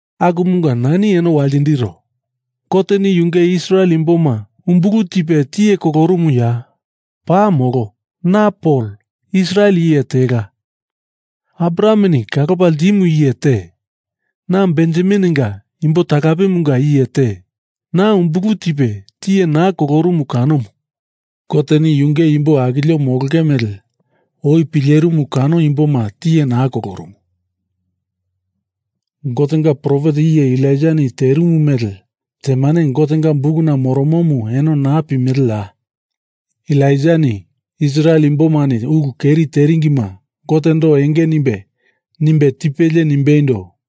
Akumunga nani eno waltindiro: Goteni yunge Israel imboma umbulu tipe tiye kolorumuya? Paa molo! Na Pol Israel iye tela, Abrahameni kalopa ltimu iye te, na Benjamininga imbo talapemunga iye te. Na umbulu tipe tiye naa kolorumu kanomu. Goteni yunge imbo akilio molonge mele oi pilerimu kano imboma tiye naa kolorumu. Gotenga profet iye Elaijani terimu mele temane Gotenga Bukuna moromomu eno naa pimeleya? Elaijani Israel imbomani ulu keri teringima Gotendo enge nimbe, nimbe tipelie nimbeindo,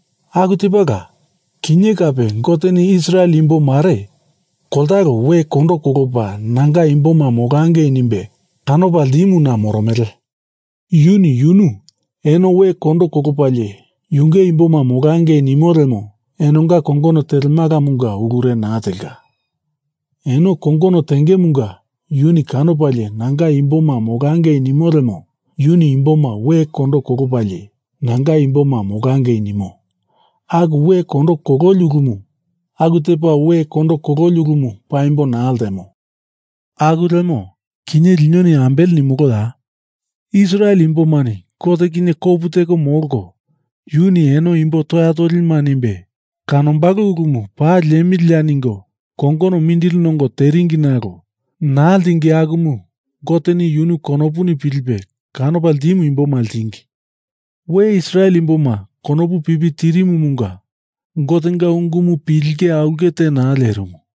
Aku tepala, kinye kape Goteni Israel imbo mare koltalo we kondo kolopa nanga imboma molangei nimbe kanopa ltimuna moromele. Yuni yunu eno we kondo kolopalie yunge imboma molangei nimo lemo enonga kongono telemalamunga ulure naa telka. Eno kongono tengemunga yuni kanopalie nanga imboma molangei nimo lemo yuni imboma we kondo kolopalie, nanga imboma molangei nimo aku we kondo kololi ulumu, aku tepa we kondo kololi ulumu paimbo naa ltemo. Aku lemo kinye linoni ambele nimoloya? Israel imbomani Gote kinye kopu teko molko yuni eno imbo toya tolima nimbe kanombalo ulumu paa liemiliya ningo kongono mindili nongo teringi nalo naa ltingi akumu Goteni yunu konopuni pilipe kanopa ltimu imboma ltingi. We Israel imboma konopu pipi tirimumunga Gotenga ungumu pilinge aulke te naa lierimu.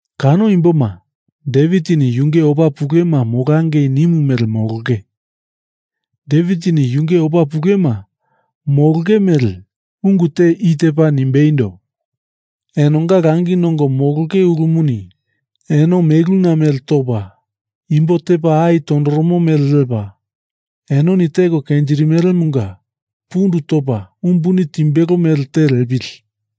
Kano imboma Devitini yunge opa pulema molangei nimu mele molonge. Devitini yunge opa pulema molonge mele ungu te i tepa nimbeindo, Enonga langi nongo molonge ulumuni eno meluna mele topa, imbo tepa ai tondoromo mele lepa, enoni teko kenjirimelemunga pundu topa umbuni timbelo mele te lepili.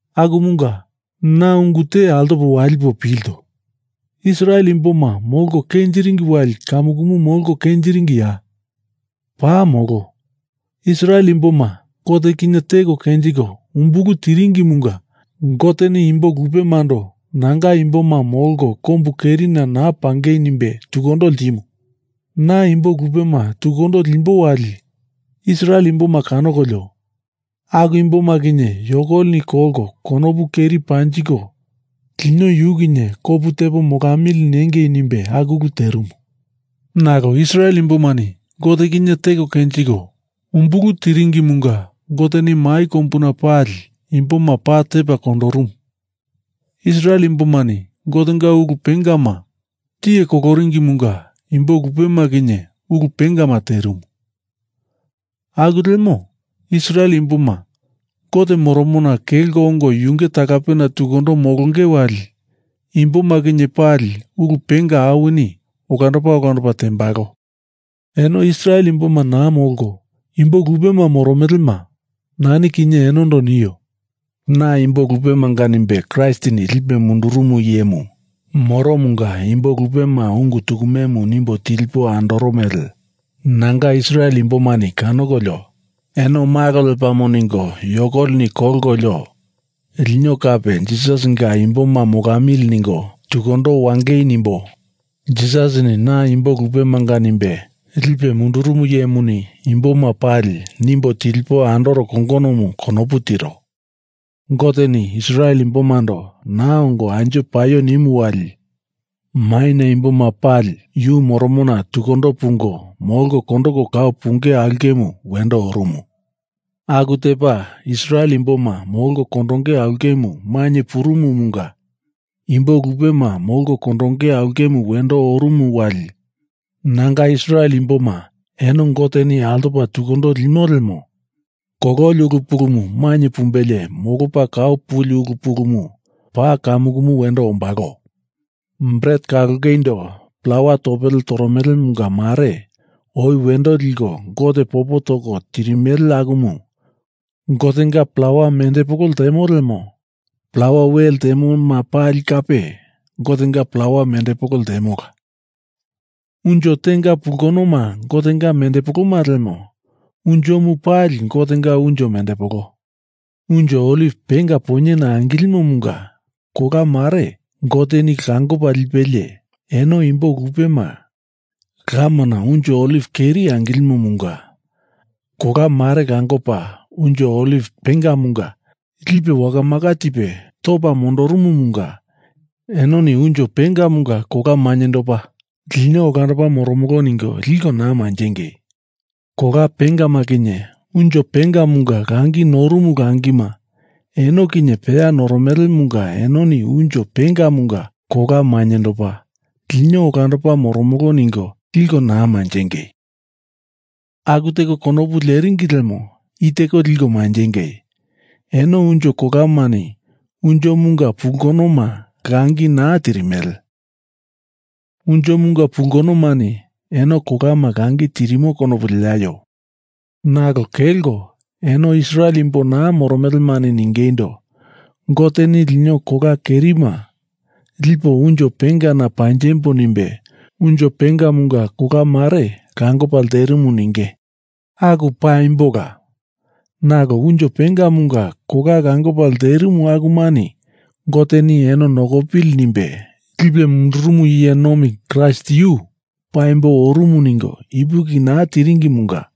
Akumunga na ungu te altopo walipo pilto: Israel imboma molko kenjiringi wali kamukumu molko kenjiringiya? Paa molo! Israel imboma Gote kinye teko kenjiko umbulu tiringimunga Goteni imbo lupemando nanga imboma molko kombu kerina naa pangei nimbe tukundo ltimu. Na imbo lupema tukundo limbo wali Israel imboma kanokolio aku imboma kinye yokolini kolko konopu keri panjiko lino yu kinye kopu tepo molamili nengei nimbe aku ulu terimu. Nalo Israel imbomani Gote kinye teko kenjiko umbulu tiringimunga Goteni mai kombuna pali imboma paa tepa kondorumu. Israel imbomani Gotenga ulu pengama tiye koloringimunga imbo lupema kinye ulu pengama terimu. Aku lemo Israel imboma Gote moromona kelko ongo yunge talapena tukundo molonge wali imboma kinye pali ulu penga awini olandopa olandopa tembalo. Eno Israel imboma naa molko imbo lupema moromelema, nani kinye enondo nio. Na imbo lupemanga nimbe Kraistini lipe mundurumu iyemu moromunga imbo lupema ungu tukumemu nimbo tilipo andoro mele nanga Israel imbomani kanokolio eno malo lepamo ningo yokolini kolkolio lino kape Jisasinga imboma molamili ningo tukundo wangei nimbo Jisasini na imbo lupemanga nimbe lipe mundurumu iyemuni imboma pali nimbo tilipo andoro kongonomu konopu tiro. Goteni Israel imbomando naa ongo anjo paio nimu wali maina imboma pali yu moromona tukundo pungo molko kondoko kau punge aulkemu wendo orumu. Aku tepa Israel imboma molko kondonge aulkemu mainye purumumunga imbo lupema molko kondonge aulkemu wendo orumu wali nanga Israel imboma eno Goteni altopa tukundo limo lemo kololi ulu pulumu mainye pumbelie molopa kau puli ulu pulumu paa kamukumu wendo ombalo. Bret kalongeindo plawa topele toromelemunga mare oi wendo liko Gote popo toko tirimele akumu Gotenga plawa mendepolo ltemo lemo plawa we lemoma pali kape Gotenga plawa mendepolo ltemola. Unjo tenga pulkonoma Gotenga mendepoloma lemo unjomu pali Gotenga unjo mendepolo. Unjo oliv penga poinyena angilimomunga kola mare Goteni langopa ltepalie, eno imbo lupema lamana unjo oliv keri angilimomunga kolama mele moloringimunga kola mare langopa unjo oliv pengamunga lipe wakamaka tipe topa mondorumumunga enoni unjo pengamunga kola mainyendopa, lino olandopa moromolo ningo liko naa manjengei! Kola pengama kinye unjo pengamunga langi norumu langima eno kinye peya noromelemunga enoni unjo pengamunga kola mainyendopa, lino olandopa moromolo ningo liko naa manjengei! Aku teko konopu leringi lemo i teko liko manjengei: Eno unjo kolamani unjomunga pulkonoma langi naa tirimele. Unjomunga pulkonomani eno kolama langi tirimo konopu leaio. Nalo kelko eno Israel imbo naa moromelemani ningeindo, Goteni lino kola kerima lipo unjo pengana panjembo nimbe unjo pengamunga kola mare langopa lterimu ninge. Aku paimbola. Nalo unjo pengamunga kola langopa lterimu akumani Goteni Eno nokopili nimbe lipe mundurumu iye nomi Kraist yu paimbo orumu ningo ipuki naa tiringimunga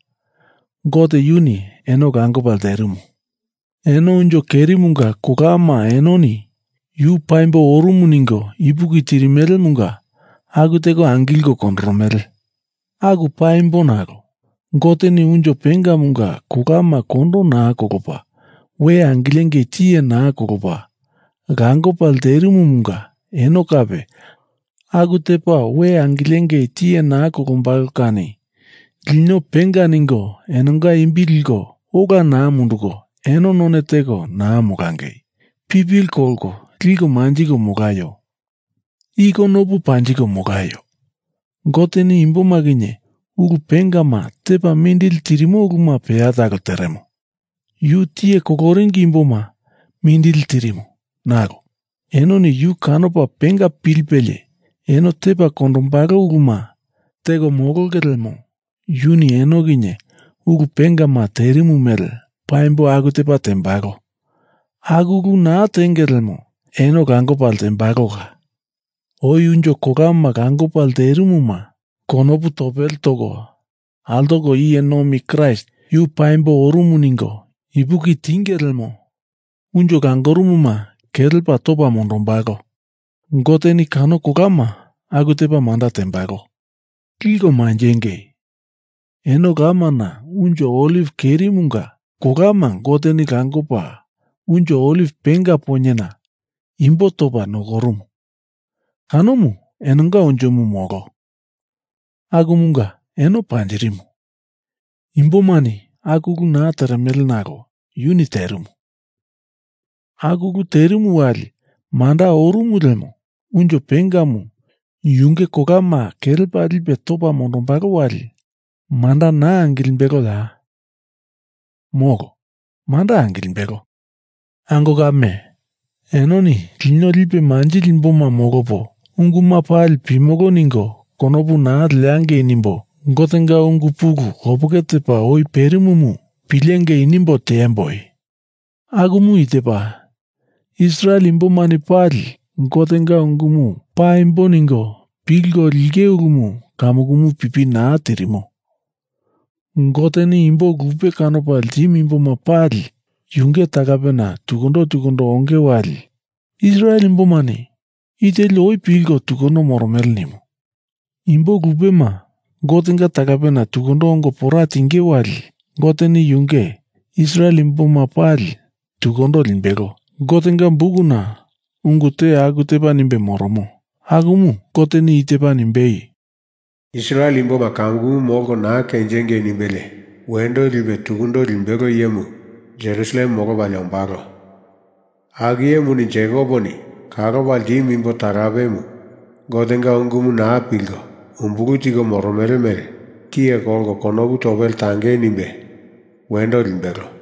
Gote yuni eno langopa lterimu. Eno unjo kerimunga kolama enoni Yu paimbo orumu ningo ipuki tirimelemunga aku teko angilko kondoromele. Aku paimbo nalo Goteni unjo pengamunga kolama kondo naa kolopa we angilengei tiye naa kolopa langopa lterimumunga eno kape aku tepa we angilengei tiye naa kolombalo kani lino penga ningo enonga imbi liko ola naa munduko eno none teko naa molangei. Pipili kolko liko manjiko molaio. I konopu panjiko molaio: Goteni imboma kinye ulu pengama tepa mindili tirimo uluma peya talo teremo. Yu tiye koloringi imboma mindili tirimu, nalo enoni yu kanopa penga pilipelie eno tepa kondombalo uluma teko molonge lemo yuni eno kinye ulu pengama terimu mele paimbo aku tepa tembalo. Aku ulu naa tenge lemo eno langopa ltembalola. Oi unjo kola langopa lterimuma konopu topele toko altoko iye nomi Kraist yu paimbo orumu ningo ipuki tinge lemo unjo langorumuna kelepa topa mondombalo. Goteni kano kolama aku tepa manda tembalo. Liko manjengei! Eno lamana unjo oliv kerimunga kolama Goteni langopa unjo oliv penga poinyena imbo topa nokorumu, kanomu enonga unjomu molo, akumunga eno panjirimu. Imbomani aku ulu naa teremele nalo yuni terimu. Aku ulu terimu wali manda orumu lemo unjo pengamu yunge kolama kelepa lipe topa mondombalo wali manda naa angilimbeloya? Molo, manda angilimbelo! Ango kame, enoni lino lipe manjili imboma molopo unguma pali pimolo ningo konopu naa leangei nimbo Gotenga ungu pulu lopeke tepa oi perimumu pilengei nimbo tiemboi. Akumu i tepa: Israel imbomani pali Gotenga ungumu Paimbo ningo pilko linge ulumu kamukumu pipi naa tirimo. Goteni imbo lupe kanopa ltimu imboma pali yunge talapena tukundo tukundo onge wali Israel imbomani i teli oi pilko tunduko moromele nimu. Imbo lupema Gotenga talapena tukundo ongo pora tinge wali Goteni yunge Israel imboma pali tukundo limbelo. Gotenga Bukuna ungu te aku tepa nimbe moromo, akumu Goteni i tepa nimbei, Israel imboma kamukumu molko naa kenjingei nimbelie wendo lipe tukundo limbelo iyemu Jerusalem molopalie ombalo. Aku iyemuni Jekoponi kalopa ltimu imbo talapemu Gotenga ungumu naa pilko umbulu tiko moromele mele tiye kolko konopu topele tangei nimbe wendo limbelo.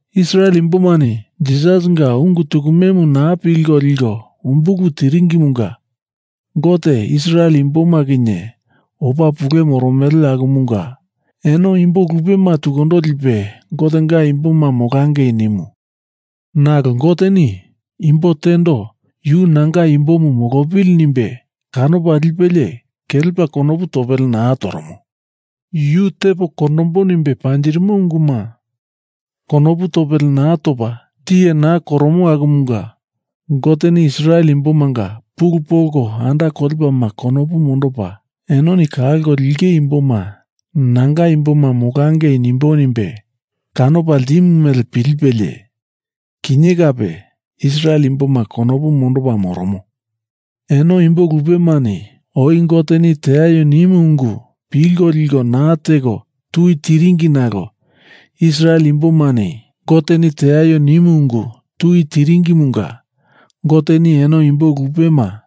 Israel imbomani Jisasinga ungu tukumemu naa pilko liko umbulu tiringimunga Gote Israel imboma kinye opa pule moromele akumunga eno imbo lupema tukundo lipe Gotenga imboma molangei nimu. Nalo Goteni imbo tendo Yu nanga imbomu molopili nimbe kanopa lipelie kelepa konopu topele naa toromo. Yu tepo kondombo nimbe panjirimo unguma konopu topele naa topa tiye naa koromo akumunga Goteni Israel imbomanga pulu polko anda kolepalema konopu mondopa enoni kalko linge imboma nanga imboma molangei nimbo nimbe kanopa ltimu mele pilipelie kinye kape Israel imboma konopu mondopa moromo. Eno imbo lupemani oi Goteni Teaio nimu ungu pilko liko naa teko tui tiringi nalo Israel imbomani Goteni Teaio nimu ungu tui tiringimunga Goteni eno imbo lupema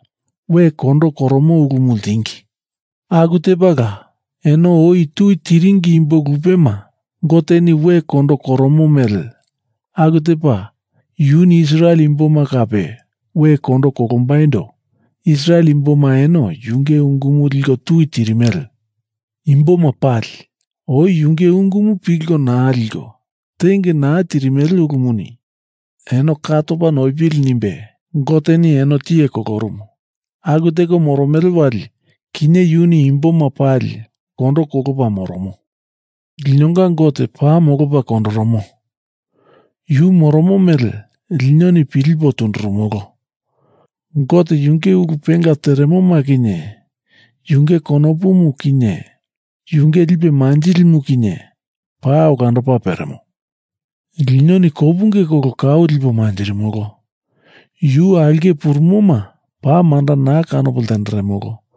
we kondo koromo ulumu ltingi. Aku tepala, eno oi tui tiringi imbo lupema Goteni we kondo koromo mele aku tepa yuni Israel imboma kape we kondo kolombaindo Israel imboma eno yunge ungumu liko tui tirimele. Imboma pali oi yunge ungumu pilko naa liko tenge naa tirimele ulumuni eno ka topa noipili nimbe Goteni eno tiye kolorumu. Aku teko moromele wali kinye yuni imboma pali kondo kolopa moromo. Linonga Gote paa molopa kondoromo. Yu moromo mele linoni pilipo tundurumolo. Gote yunge ulu penga teremoma kinye yunge konopumu kinye yunge lipe manjilimu kinye paa olandopa peremo. Linoni kopunge kolo kau lipo manjirimolo. Yu aulke purumoma paa manda naa kanopo lenderemolo.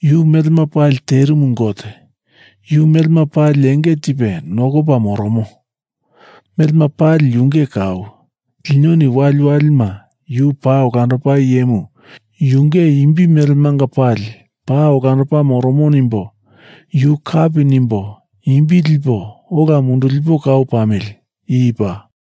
Yu melema pali terimu Gote; yu melema pali enge tipe nokopa moromo; melema pali yunge kau. Linoni wali walima Yu paa olandopa iyemu Yunge imbi melemanga pali paa olandopa moromo nimbo yu kapi nimbo imbi lipo ola mundulipo kau pamili. I paa.